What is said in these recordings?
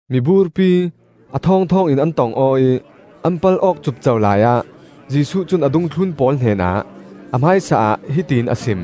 Miburpi a thawngthawng in an tong aw ih an pal awk cupco laiah Jesuh cun a dungthlun pawl hnenah a hmaisa ah hiti in a sim: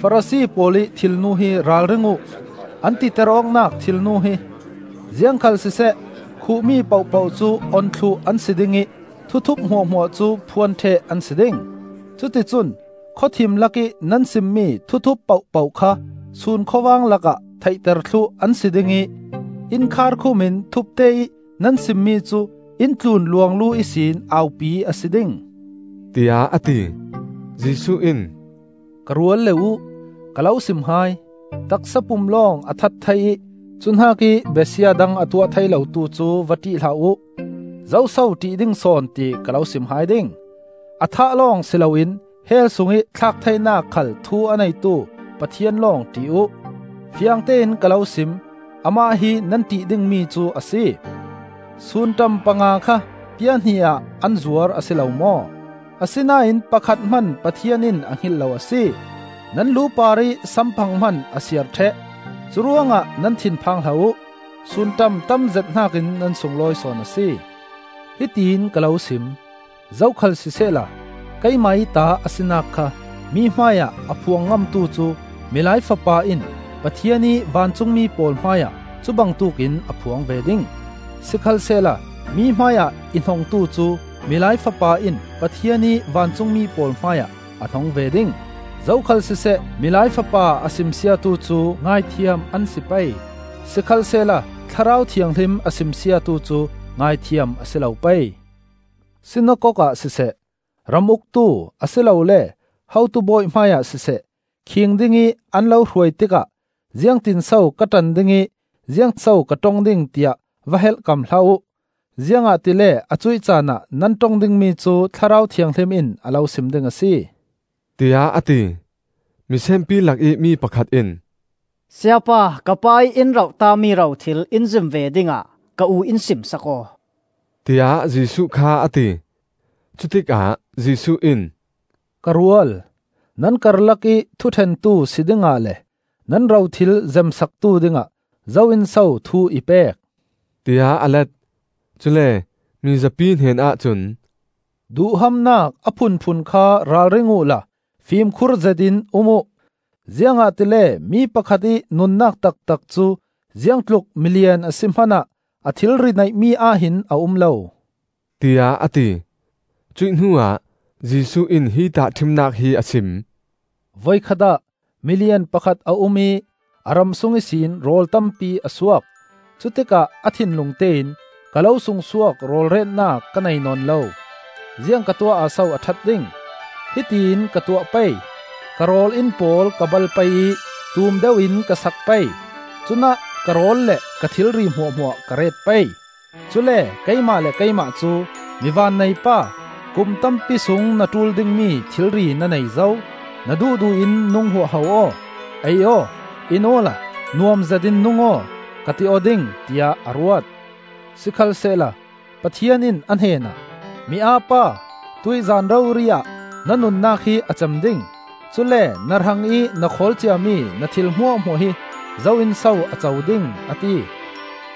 “Farasi pawl ih thilnu hi ralring uh; an titer awknak thilnu hi! Ziangkhalsiseh khuhmi pohpoh cu on thluh an si ding ih thuthup hmuahhmuah cu phuan ṭheh an si ding. Cuticun khawthim lakih nan simmi thuthup pohpoh kha sun khawvang lakah theihter thluh an si ding ih inn kharhkhumin thupte ih nan simmi cu inn tlun luanglu ihsin aupi a si ding,” tiah a ti. Jesuh in, “Ka rualle uh, ka lo sim hai: taksa pum lawng a that thei ih cuhnakih besia dang a tuah thei lotu cu va ṭih hlah uh. Zoso ṭih ding sawn, ti ka lo sim hai ding: a thah lawng si loin hell sungih thlak theinak khal thu a neitu Pathian lawng ṭih uh. Fiangtein ka lo sim: Amah hi nan ṭih dingmi cu a si! Sunṭam panga kha pia hnih ah an zuar a si lo maw? Asinain pakhat hman Pathian in a hngilh lo a si. Nan lu parih samphang hman a siar ṭheh. Curuangah nan thin phang hlah uh; sunṭam tamzet hnakin nan sunglawi sawn a si. “Hitiin ka lo sim: zokhal sisehla keimah ih ta a sinak kha mi hmaiah a phuang ngamtu cu Milai Fapa in Pathian ih vancungmi pawl hmaiah cubangtuk in a phuang ve ding. Sikhalsehla mi hmaiah i hnongtu cu Milai Fapa in Pathian ih vancungmi pawl hmaiah a hnong ve ding. “Zokhal siseh Milai Fapa a simsiatu cu ngaihthiam an si pei; sikhalsehla Thlarau Thianghlim a simsiatu cu ngaihthiam a si lo pei. “Sinakok ah siseh, ram uktu a si lole hotu bawi hmaiah siseh khiing dingih an lo hruai tikah ziangtinso ka ṭan ding ih ziangso ka ṭong ding tiah va helhkam hlah uh. Ziangahtile a cuih caan ah nan ṭong dingmi cu Thlarau Thianghlim in a lo sim ding a si,” tiah a ti. Misenpi lakih mi pakhat in, “Sayapa, ka pa ih in roh tami rothil in zem ve dingah ka u in sim sak aw,” tiah Jesuh kha a ti. Cutikah Jesuh in, “Ka rual, nan karlakih thuṭhentu si dingah le nan rothil zemsaktu dingah zo in so thu i pek?” tiah a let. Cule mi zapi hnenah cun, “Duhhamnak a phunphun kha ralring uhla fimkhur zetin um uh; ziangahtile mi pakhat ih nunnak taktak cu, ziangtluk milian a si hmanah, a thilri neihmi ahhin a um lo,” tiah a ti. Cuih hnuah Jesuh in hi tahṭhimnak hi a sim: “Voikhat ah milian pakhat a um ih a ram sung ihsin rawl tampi a suak. Cutikah a thinlung tein ‘Ka lo sungsuak rawl retnak ka nei nawn lo. Ziang ka tuah ah so a ṭhat ding? Hitiin ka tuah pei: Ka rawl-inn pawl ka bal pei ih tum deuh in ka sak pei. Cunah ka rawl le ka thilri hmuahhmuah ka ret pei. Cule keimah le keimah cu: Mi vannei pa! Kum tampi sung na ṭul dingmi thilri na nei zo. Na duhduh in nung huahho aw; ei aw, in awla nuam zetin nung aw, ka ti aw ding,’ tiah a ruat. Sikhalsehla Pathian in a hnenah, ‘Mi-aa pa! Tuih zan rori-ah na nunnak hi a cem ding; cule na hrangih na khawlcia mi na thil hmuahhmuah hi zo in so a co ding?’ a ti,”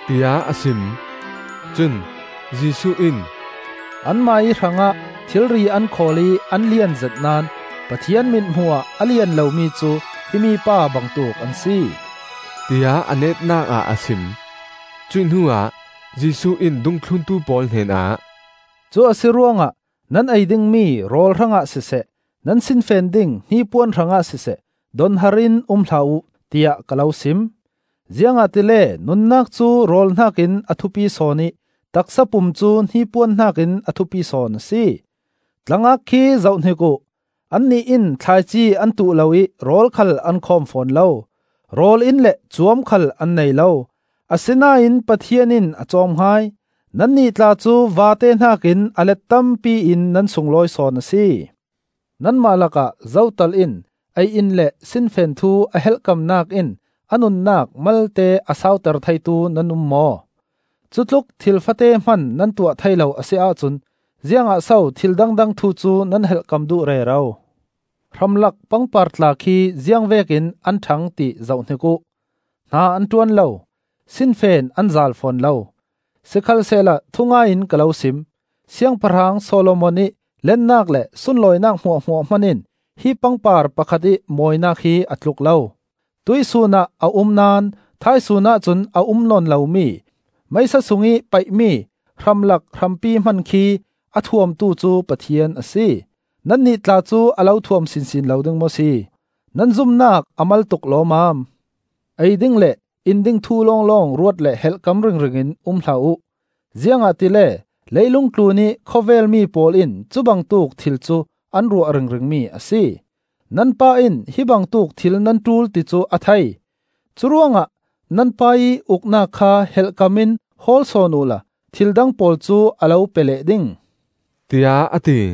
tiah a sim. Cun Jesuh in, “Anmah ih hrangah thilri an khawl ih an lianzet naón Pathian mithmuh ah a lian lomi cu himi pa bangtuk an si,” tiah a netnak ah a sim. Cuih hnuah Jesuh in dungthluntu pawl hnenah, “Cu a si ruangah nan ei dingmi rawl hrangah siseh, nan sinfen ding hnipuan hrangah siseh, donhar in um hlah uh, tiah ka lo sim. Ziangahtile nunnak cu rawl hnakin a thupi sawn ih taksapum cu hnipuan hnakin a thupi sawn a si. Tlangak khi zohhnik uh; annih in thlaici an tuh lo ih rawl khal an khawm fawn lo. Rawl-inn le cuam khal an nei lo. Asinain Pathian in a cawm hai. Nannih tla cu vate hnakin a let tampi in nan sunglawi sawn a si. Nanmah lakah zotal in ei-in le sinfen thu a helhkamnak in a nunnak malte a sauter theitu nan um maw? Cutluk thil fate hman nan tuah thei lo a si ahcun ziangah so thil dangdang thu cu nan helhkam duh rero? Hramlak pangpar tla khi ziangvekin an ṭhang ti zohhnik uh: hna an ṭuan lo, sinfen an zaal fawn lo. Sikhalsehla thungai in ka lo sim: Siangpahrang Solomon ih lennak le sunlawinak hmuahhmuah hman in hi pangpar pakhat ih mawinak hi a tluk lo. Tuihsun ah a um naón thaisun ahcun a um nawn lomi, meisa sungih paih-mi hramlak hrampi hman khi a thuamtu cu Pathian a si. Nannih tla cu a lo thuam sinsin lo ding maw si? Nan zumnak a mal tuk lawmmam! “Ei ding le in ding thu lawng ruat le helhkam ringringin um hlah uh. Ziangahtile leilung tlunih khawvel mi pawl in cubangtuk thil cu an ruah ringringmi a si. Nan Pa in hi bangtuk thil nan ṭul ti cu a thei. Curuangah nan Pa ih Uknak kha helhkam in hawl sawn uhla thil dang pawl cu a lo pe leh ding,” tiah a ti.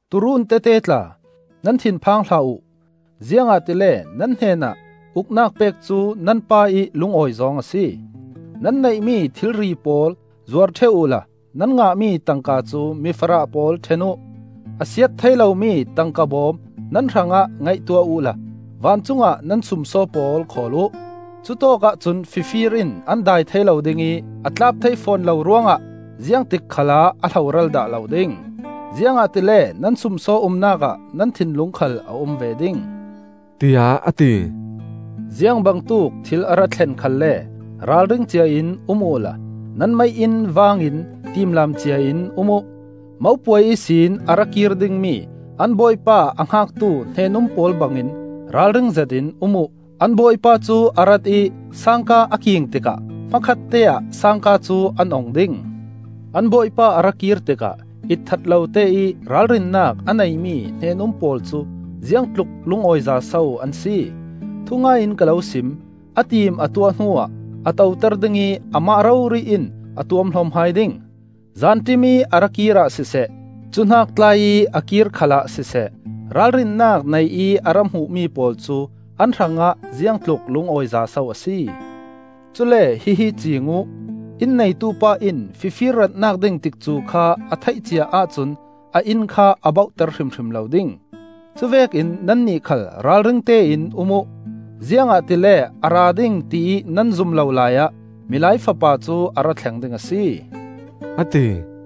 Tuurun tete tla, nan thinphang hlah uh; ziangahtile nan hnenah Uknak pek cu nan Pa ih lungawi zawng a si. Nan neihmi thilri pawl zuar ṭheh uhla nan ngahmi tangka cu mifarah pawl ṭhen uh. A siat thei lomi tangka bawm nan hrangah ngaihtuah uhla vancung ah nan sumsaw pawl khawl uh. Cutawkah cun fifir in an dai thei lo ding ih a tlap thei fawn lo ruangah ziangtik khalah a hloral dah lo ding. Ziangahtile nan sumsaw umnak ah nan thinlung khal a um ve ding,” tiah a ti. Ziangbangtuk thil a ra thlen khalle ralring ciain um uhla nan mei-inn vangin timlaam ciain um uh. Mopuai ihsin a ra kir dingmi an bawipa a hngaktu hnen-um pawl bangin ralring zetin um uh. An bawipa cu a rat ih sangka a king tikah hmakhatte ah sangka cu an ong ding. An bawipa a ra kir tikah itthat loteih ralrinnak a neimi hnen-um pawl cu ziangtluk lungawiza so an si. Thungai in ka lo sim: a tim a tuah hnuah a toter ding ih amah rori in a tuamhlawm hai ding. Zanṭim ih a ra kirah siseh, cuhnak tlai ih a kir khalah siseh, ralrinnak nei ih a ra hmuhmi pawl cu an hrangah ziangtluk lungawiza so a si! Cule hihi ciing uh: inn neitu pa in fifir ratnak ding tikcu kha a theih cia ahcun a inn kha a bauhter hrimhrim lo ding. Cuvekin nannih khal ralringte in um uh, ziangahtile a ra ding tiih nan zum lo laiah Milai Fapa cu a ra thleng ding a si,” a ti.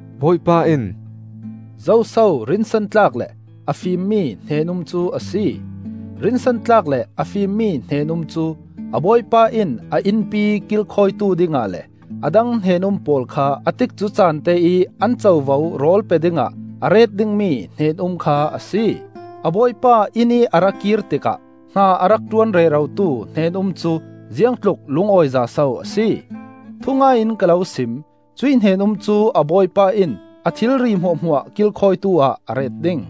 Bawipa in, “Zoso rinsan tlak le a fimmi hnen-um cu a si? Rinsan tlak le a fimmi hnen-um cu a bawipa in a innpi kilkhawitu dingah le a dang hnen-um pawl kha a tikcu caan te ih an covo rawl pe dingah a ret dingmi hnen-um kha a si. A bawipa innih a ra kir tikah hna a rak ṭuan rerotu hnen-um cu ziangtluk lungawiza so a si! Thungai in ka lo sim: cuih hnen-um cu a bawipa in a thilri hmuahhmuah kilkhawitu-ah a ret ding.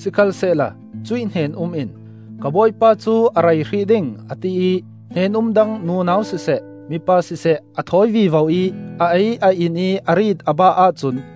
Sikhalsehla cuih hnen-um in, ‘Ka bawipa cu a rei hrih ding,’ a tiih hnen-um dang nunau siseh mipa siseh a thawi vivo ih a ei a in ih a riit a bah ahcun,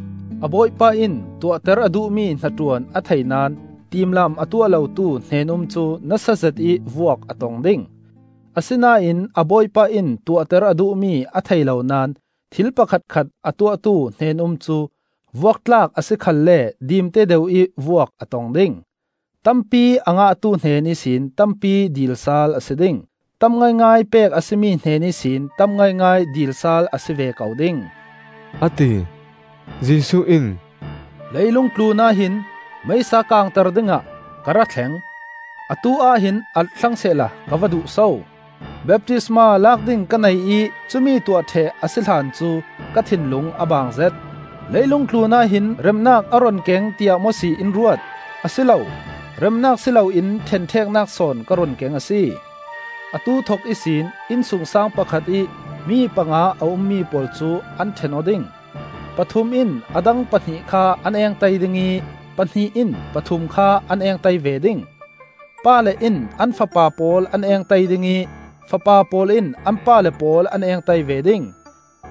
A bawipa in tuahter a duhmi hnaṭuan a thei naón tiimlaam a tuah lotu hnen-um cu nasa zetih vuak a tong ding. Asinain a bawipa in tuahter a duhmi a thei lo naón thil pakhatkhat a tuahtu hnen-um cu vuak tlak a si khalle dimte deuh ih vuak a tong ding. Tampi a ngahtu hnen ihsin tampi dil sal a si ding. Tam ngaingai pek a si mi hnen ihsin tam ngaingai dil sal a si ve ko ding,” a ti. Jesuh in, “Leilung tlunah hin meisa kangter dingah ka ra thleng; atu-ah hin alh thlang sehla ka va duh so! Baptisma lak ding ka nei ih cumi tuah ṭheh a si hlan cu ka thinlung a baangzet. Leilung tlun ahhin remnak a run keng tiah maw si in ruat? A si lo, remnak si loin ṭhenṭheknak sawn ka run keng a si. Atu thok ihsin innsungsaang pakhat ih mi panga a ummi pawl cu an ṭhen aw ding; pathum in a dang pahnih kha an engtai ding ih pahnih in pathum kha an engtai ve ding. Pale in an fapa pawl an engtai ding ih fapa pawl in an pale pawl an engtai ve ding.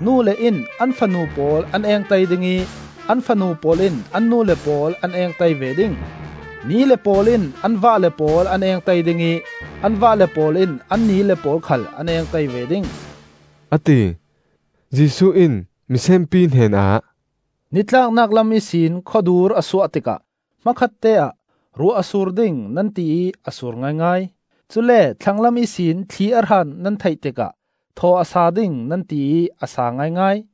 Nule in an fanu pawl an engtai ding ih an fanu pawl in an nule pawl an engtai ve ding. Nile pawl in an vahle pawl an engtai ding ih an vahle pawl in an nile pawl khal an engtai ve ding,” a ti. Jesuh in misenpi hnenah, “Nitlaknak lam ihsin khawdur a suah tikah hmakhatte ah ‘Ruah a sur ding,’ nan tiih a sur ngaingai. Cule thlanglam ihsin thli a hran nan theih tikah ‘Thaw a sa ding,’ nan tiih a sa ngaingai.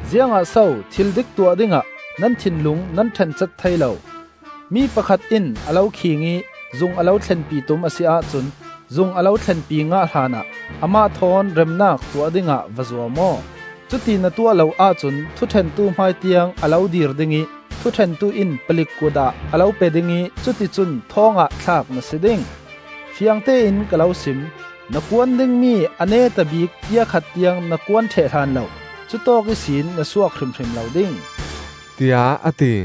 Ziangah so thil dik tuah dingah nan thinlung nan ṭhen cat thei lo? Mi pakhat in a lo khiing ih zung a lo thlenpi tum a si ahcun zung a lo thlenpi ngah hlanah amah thawn remnak tuah dingah va zuam aw. Cuti na tuah lo ahcun thuṭhentu hmai tiang a lo dir ding ih thuṭhentu in palik kut ah a lo pe ding ih cuticun thawng ah thlak na si ding. Fiangtein ka lo sim: na kuan dingmi a neta bik pia khat tiang na kuan ṭheh hlan lo cutawk ihsin na suak hrimhrim lo ding,” tiah a ti.